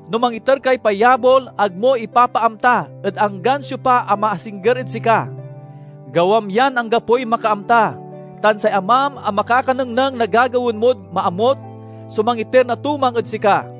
No mangiter kay payabol, ag mo ipapaamta ed anggan siopa a maasingger ed sika. Gawam yan anggapoy makaamta, tan say Amam a makakanengneng na gagawaen mod maamut so mangiter na tumang ed sika."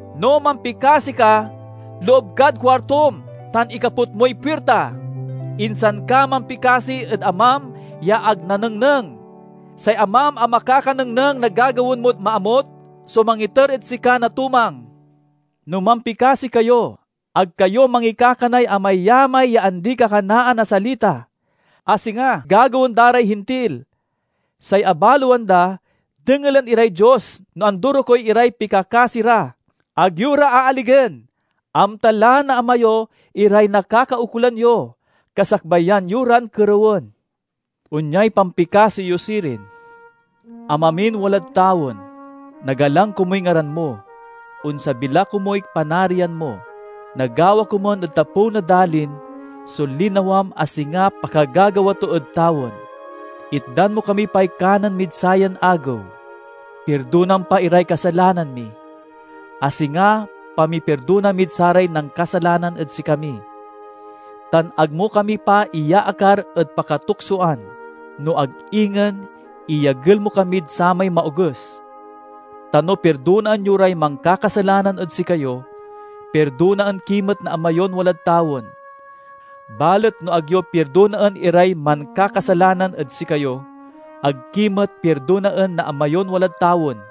No mampikasi ka, loob kad kuartom tan ikaput moy puirta, insan ka mampikasi ed Amam ya ag nanengneng. Say Amam a makakanengneng na gagawaen mod maamut so mangiter ed sika na tumang. "No mampikasi kayo ag kayo mangikakanay amayamay ya andi-kakanaan a salita, a singa gagawaen da ray Hintil. Say abaloan da dengelen iray Dios no andorokey iray pikakasi ra. Ag yo ra aaligen! Amta la na Ama yo iray nakakaukolan yo, kasakbayan yo ran kerewen. Onyay pampikasi yo sirin: 'Ama min walad tawen: Nagalang komuy ngaran mo; onsabi la komuy Panarian mo; nagawa komun ed tapew na dalin so linawam a singa pakagagawa to ed tawen. Itdan mo kami pay kanen mid sayan agew. Pirdonam pa iray kasalanan mi, a singa pamipirdona mid saray nankasalanan ed sikami. Tan ag mo kami pa iyaakar ed pakatuksoan, no ag ingen iyagel mo kamid samay Maoges.' "Ta no pirdonaen yo ray mankakasalanan ed sikayo, pirdonaen ki met na Ama yon walad tawen. Balet no ag yo pirdonaen iray mankakasalanan ed sikayo, ag ki met pirdonaen na Ama yon walad tawen."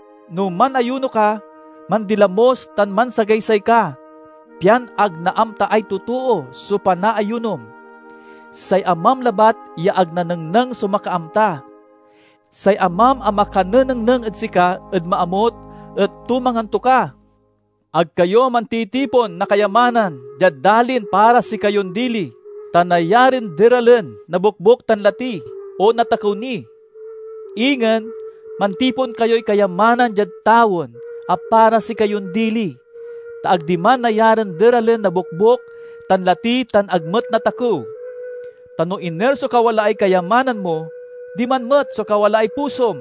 No manayuno ka, mandilamos tan mansagaysay ka, pian ag naamtaay totoo so panaayunom; say Amam labat ya ag nanengneng so makaamta. Say Amam a makanenengneng ed sika ed maamut et tumangan to ka. "Ag kayo mantitipon na kayamanan diad dalin para sikayon dili, ta nayarin deralen na bokbok tan lati, o natakew ni. Ingen, mantipon kayoy kayamanan diad tawen a para sikayon dili, ta ag diman nayarin deralen na bokbok tan lati tan ag met natakew. Ta no iner so kawalaay kayamanan mo, diman met so kawalaay pusom."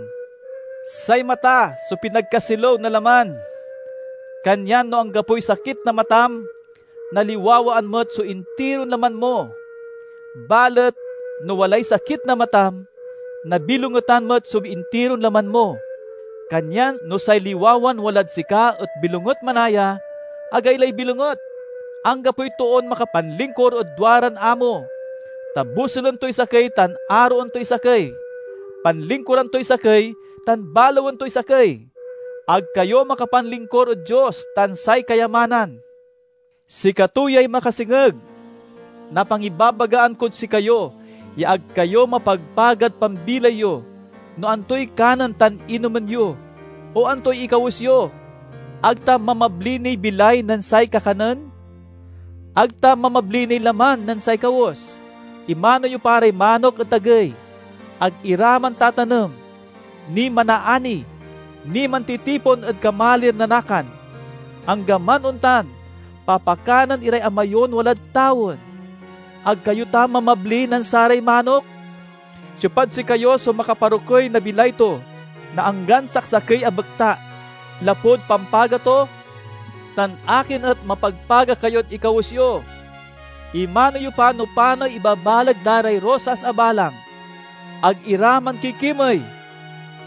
"Say mata so pinagkasilew na laman. Kanyan no anggapoy sakit na matam, naliwawaan met so intiron laman mo. Balet no walay sakit na matam, nabilongetan met so intiron laman mo. Kanyan no say liwawan walad sika et bilonget manaya, agaylay bilonget!" "Anggapoy toon makapanlingkur ed duaran amo, ta bosulen toy sakey tan aroen toy sakey, panlingkuran toy sakey tan balawen toy sakey. Ag kayo makapanlingkur ed Dios tan say kayamanan. "Sikato yay makasengeg na pangibabagaan kod sikayo ya ag kayo mapagpagad pambilay yo, no antoy kanen tan inomen yo, o antoy ikawes yo. Ag ta mamabli niy bilay nen say kakanen? Ag ta mamabli niy laman nen say kawes? Imano yo pa ray manok ed tagey. Ag ira mantatanem, ni manaani, ni mantitipon ed kamalir na nakan. Anggaman ontan, papakanen iray Ama yon walad tawen. Ag kayo ta mamabli nen saray manok? Siopad sikayo so makaparokey na bilay to na anggan saksakey a bekta, lapud pampaga to? "Tan akin et mapagpaga kayod ikawes yo? Imano yo pa no panoy ibabaleg da ray rosas a balang. Ag ira mankikimey;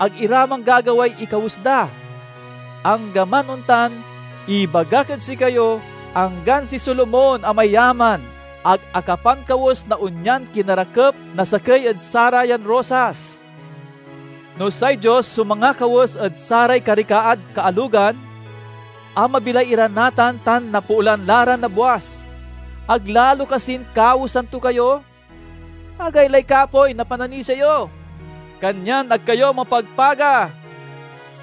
ag ira manggagaway ikawes da. Anggaman ontan, ibagak ed sikayo: anggan si Solomon a mayaman ag akapankawes na onyan kinarakep na sakey ed sarayan rosas. No say Dios so mangakawes ed saray karikaad kaalogan, a mabilay ira natan tan napoolan la ra nabwas, ag lalo kasin kawesan to kayo? Agaylay kapoy na pananisia yo! Kanyan ag kayo mapagpaga.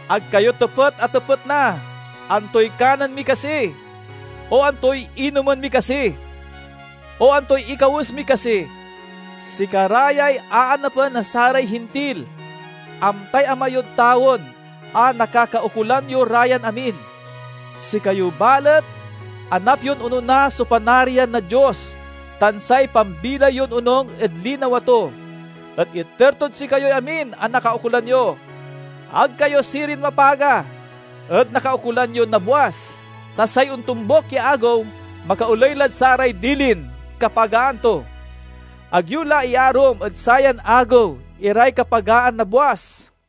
Ag kayo tepet a tepet na: 'Antoy kanen mi kasi?' o 'Antoy inomen mi kasi?' o 'Antoy ikawes mi kasi?' Sikara yay aanapen na saray Hintil. Amtay Ama yod tawen a nakakaukolan yo ra yan amin. Sikayo, balet, anap yon onona so Panarian na Dios tan say pambilay yon onung ed linawa to, et iter tod sikayoy amin a nakaukolan yo. Ag kayo sirin mapaga ed nakaukolan yo nabwas, ta say ontombuk ya agew makaoley lad saray dilin kapagaan to. Ag yo la iyaarum ed sayan agew iray kapagaan nabwas."